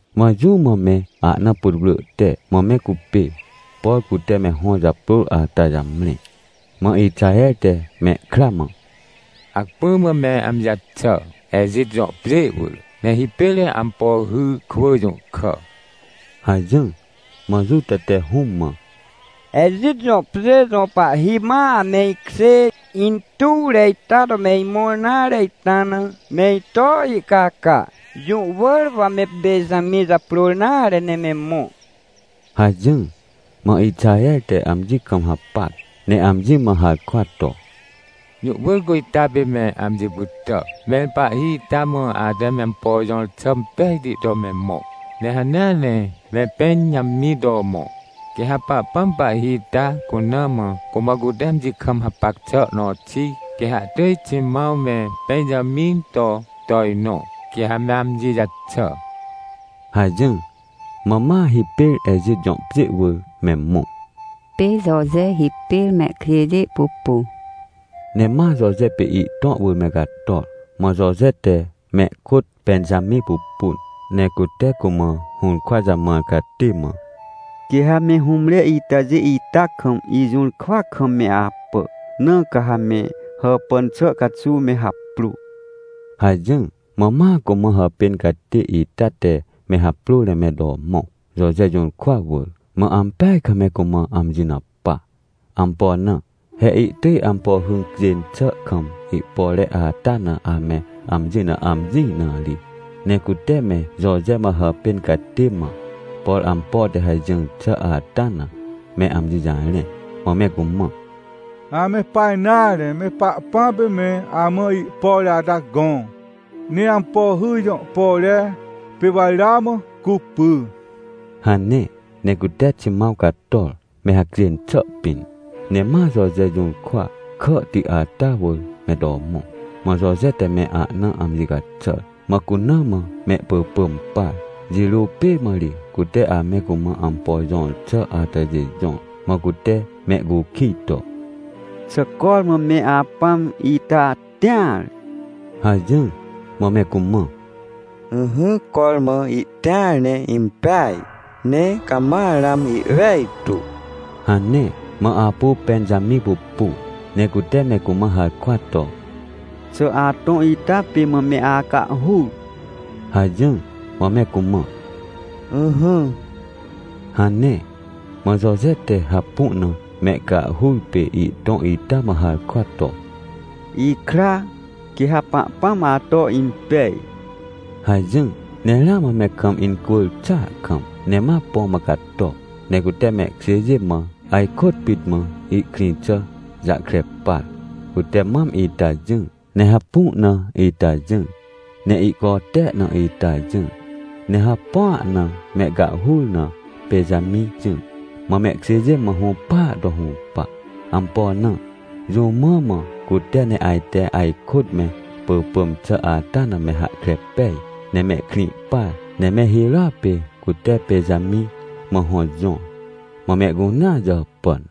Mã jũ mã me ahna putwrỳ te mã me cupê, por cute me hõ japrôr ata jamre. Mã Ixaher te mehkra mã: — Hacpỹ mã me amji jaxà, Ejit jõ pjê wỳr, ne hipêr me ampo hy kwỳ jũhkà — hajỹr. Mã Juta te hũm mã: — Ejit jõ pjê jõ pahhi ma ame ikjê intuwre ita to me imõr nare ita na, me ito ihcaca. Jũ wỳr wa me Pẽnjamĩ japrôr nare ne me mõ — hajỹr. Mã Ixaher te amji kam hapac, ne amji mã harkwa to: — Jũ wỳr cu ita pê me amji pytà, mẽr pahhi ita mã ate me ampo jõr xà impejti to me mõ, ne hanea ne me Pẽnjamĩ to mõ. Quê ha Pahpãm pahhi ita cuna mã, cumã cute amji kam hapac xà nõ xi, quê ha ihtỳj Ximãw me Pẽnjamĩ to tojnõ, quê ha me amji jaxà — hajỹr. Mã ma hipêr Ejit jõ pjê wỳr me mõ. Pê Joje hipêr mehkjêjê pupu Ne ma Joje pê ihtõ wỳr me cator. Mã Joje te mehkôt Pẽnjamĩ pupun, ne cute cumã hũrkwa jamãr catê mã: — Quê ha me hũmre itajê ita kam ijũrkwa kam me apà, na ca ha me hàpàn xà caxuw me haprô — hajỹr. Mã ma cumã hàpên catê ita te me haprôr ne me to mõ, Joje jũrkwa wỳr. Mã ampeaj kam me cumã amji na pa. Ampo na? He ihtỳj ampo hy cjên xà kam ihpore ata na ame amji na amjĩ na ri. Ne cute me Joje mã hàpên catê mã, por ampo te hajỹr xà ata na, me amji jarẽn. Mã me cumã: — Ame pa nare, me Pahpãm pê me amã ihpore ata gõ, ne ampo hy jõ pore, pê wa ramã cupy — hane. Ne cute Ximãw cator, me hacjên xà pĩn, ne ma Joje jũrkwa kàhti ata wỳr me to mõ. Mã Joje te me ahna amji caxàr, mã cuna mã mehpỳpỳm par, jirô pê mã ri cute ame cumã ampo jõr xà atajê jõr. Mã cute mehcukij to: — Xà cormã me apãm ita tĩar? — hajỹr. Mã me cumã: — Ỹhỹ, cormã ihtĩar ne impeaj, ne cama ramã ihwejtu — hane. Mã apu Pẽnjamĩ pupu, ne cute me cumã harkwa to: — Xà atõ ita pê mã me acahhur? — hajỹr. Mã me cumã: — Ỹhỹ — hane. Mã Joje te hapu na mehcahhur pê ihtõ ita mã harkwa to: — Ikra, quê ha Pahpãm ato impej — hajỹr. Ne ramã me kam incwỳr xàa kam, ne ma põ mã cato. Ne cute mehkjêjê mã ajkôt pit mã ihkrĩ xà jahkre par. Cute mam ita jỹr, ne hapu na ita jỹr, ne ihcote na ita jỹr, ne hapua na mehcahhur na, Pẽnjamĩ jỹr. Mã mehkjêjê mã hũpaa to hũpa. Ampo na? Jũ mã mã cute ne ajte ajkôt me pỳpỳm xà ata na me hahkre pej, ne me krĩ par? Ne me hirôa pê cute Pẽnjamĩ mã hõ jõr. Mã mehcunea jàpàn.